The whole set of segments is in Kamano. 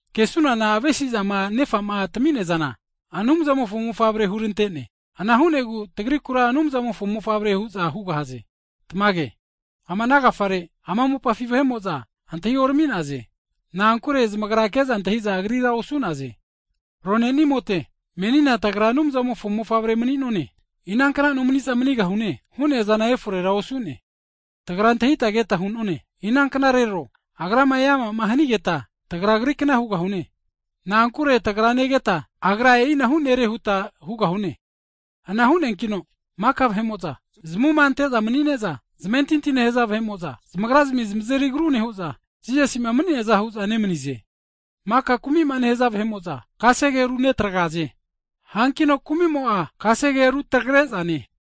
Kesunana Nerafa'ma rimpama hagerafiramino avesi'zama tantenea zana Anumzamofo mofavre hurante'ne. Ana hu'negu tagrikura Anumzamofo mofavre hu'za hugahaze. Tamage! Ama ana agafare ama mopafi vahe'mo'za antahiorami'naze. Na'ankure zamagra ke'za antahi'za Agrira osu'naze. Ronenimote, menina tagra Anumzamofo mofavre mani'none, henkama maninuna nomani'zana eforera osu'ne. Tagra antahita keta hu'none, inanknarero Agrama eama'ma hanigeta, tagra, Agrikna hugahune. Na'ankure tagra negeta Agra e'inahu Nere huta hugahune. Ana hu'neankino maka vahe'mo'za zamavuma kete'za mani'ne'za zamentintima nehaza vahe'mo'za, zamagrazmi zamazeri agru nehu'za, Jisasi'ma mani'neaza hu'za nemanize. Maka kumi'ma nehaza vahe'mo'za, kasege runetagraze, hankino kumi'mo'a kasege rutagre'zane.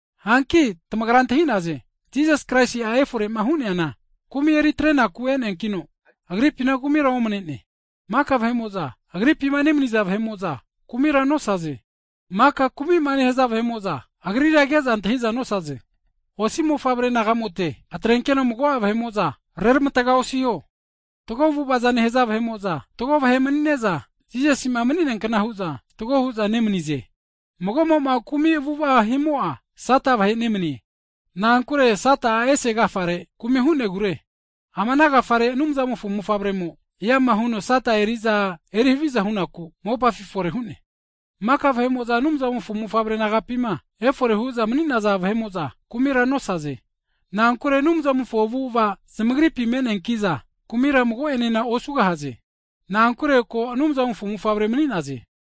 Hanki tamagra antahi'naze, Jisas Kraisi'a efore'ma hu'neana kumi eri atrenaku e'neakino, Agripina kumira omane'ne. Maka vahe'mo'za Agripima nemaniza vahe'mo'za, kumira nosaze. Kumi'ma nehaza vahe'mo'za, Agrira ke'za antahi'za nosaze. Osi mofavre naga'mote, atrenkeno mago'a vahe'mo'za reramatga osiho, fatgo avu'ava nehaza vahe'mo'za fatgo vahe'mani'ne'za, Jisasi'ma mani'neakna hu'za fatgo hu'za nemani'ze. Mago'mo'ma kumi avu'ava himo'a, Sata vahe nemanie. Na'ankure Sata'a ese agafare kumi hu'negure. Ama ana agafare Anumzamofo mofavremo, eama huno Sata erizana eri haviza hu'naku mopafi efore hu'ne. Maka vahe'mo'za Anumzamofo mofavre nagapima efore hu'za mani'naza vahe'mo'za kumira nosaze. Na'ankure Anumzamofo avu'ava zamagripi me'neanki'za, kumira mago'enena osugahaze. Na'ankure ko Anumzamofo mofavre mani'naze.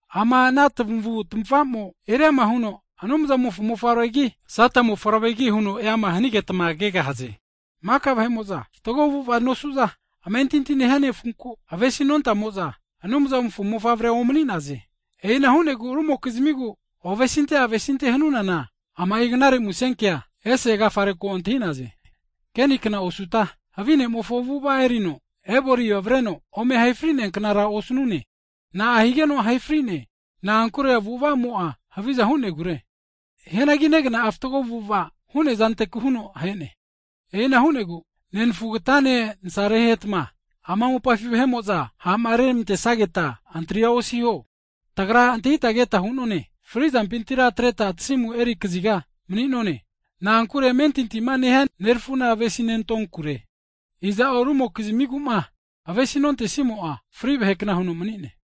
Ama ana tamavu tmava'mo eriama huno Anumzamofo mofavregi, Sata mofavregi huno eama hanigetma kegahaze. Maka vahe'mo'za fatgo avu'ava nosu'za, amentinti nehia nefunku avesi nontamo'za, Anumzamofo mofavre omani'naze. E'ina hu'negu rumokizmigu ovesinte avesinte hanunana ama'i knare musen (gutnius) kea ese agafare ko antahi'naze. Kenima hu'neankna osuta, havi ne'mofo avu'ava erino Ebolina avareno ome ahe fri'nea knara osanune. Na'a higeno ahe fri'ne? Na'ankure avu'ava'mo'a haviza hu'negure. Hianagi negna'a fatgo avu'ava hu'nea zanteku huno ahe'ne. E'ina hu'negu nenafugatane nasarahetma ama mopafi vahe'mo'za ha'ma reramantesageta antria osiho. Tagra antahita keta hu'none, fri'zampintira atreta tasimu eri kaziga mani'none. Na'ankure amentintima nehia nerafuna avesinentonkure. Iza'o rumokizamigu'ma avesi nontesimo'a, fri vahekna huno mani'ne.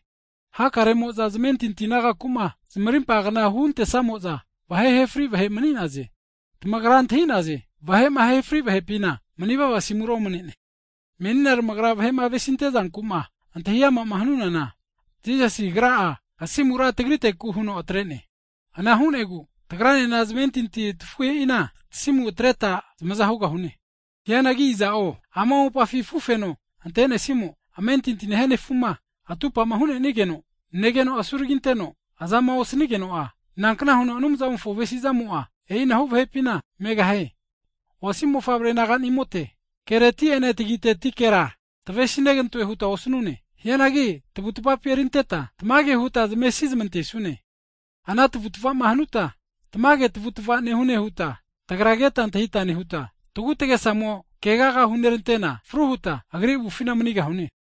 Hakaremo'za zamentinti nagaku'ma (kristen) zamarimpa kna huntesamo'za, vahe ahe fri vahe mani'naze. Tamagra antahi'naze, vahe'ma ahe fri vahepina mani'vava asimura omane'ne. Menina tagrama vahe'ma avesinte'zanku'ma antahiama'ma hanunana, Jisasi Agra'a asimura tagriteku huno atre'ne. Ana hu'negu tagranena zamentinti tafuhe'ina tasimu atreta zamaza hugahune. Hianagi iza'o ama mopafi afu feno ante'nesimo, amentinti nehia nefu'ma atupama hu'nenigeno negeno asuragi anteno azama osanigeno'a, nankna huno Anumzamofo avesi'zamo'a, e'inahu vahepina megahie? Osi mofavre naganimote kereti'ene tagitetikera tavesi negantone huta osanune. Hianagi tavutvapi erinteta tamage huta zamesi zamantesune. Ana tavutva'ma hanuta, tamage tavutava nehune huta tagra keta antahita nehuta, tagutagesamo'ma keagama hunerantena, fru huta Agri avufina manigahune.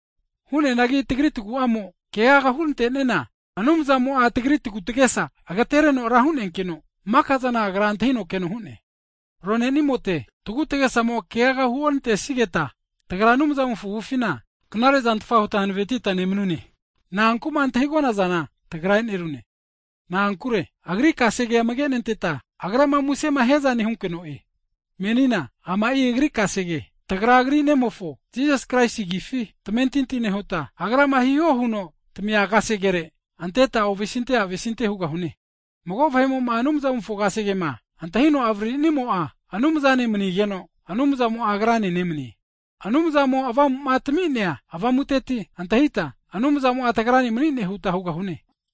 Hu'neanagi tagri taguamo, keaga hurante'niana Anumzamo'a tagri tagutagesa agatereno ra hu'neankino, maka'zana Agra antahino keno hu'ne. Ronenimote, tagu tagesamo keaga huorantesigeta, tagra Anumzamofo avufina knare'zantfa huta hanavetita nemanune. Na'anku'ma antahigona'zana tagra e'nerune, na'ankure Agri kasegea amage nenteta, Agrama muse hiaza nehunkeno'e. Menina ama'i Agri kasege, tagra Agri Nemofo Jisas Kraisi agifi tamentinti nehuta, Agrama hiho huno tami'nea kasegere amage anteta ovesinte avesinte hugahune. Mago vahe'mo'ma Anumzamofo kasegema antahino avaririmo'a Anumzane manigeno, Anumzamo'a agrane nemanie. Anumzamo Avamu'ma tami'nea Avamuteti antahita, Anumzamo'a tagrane mani'ne huta hugahune.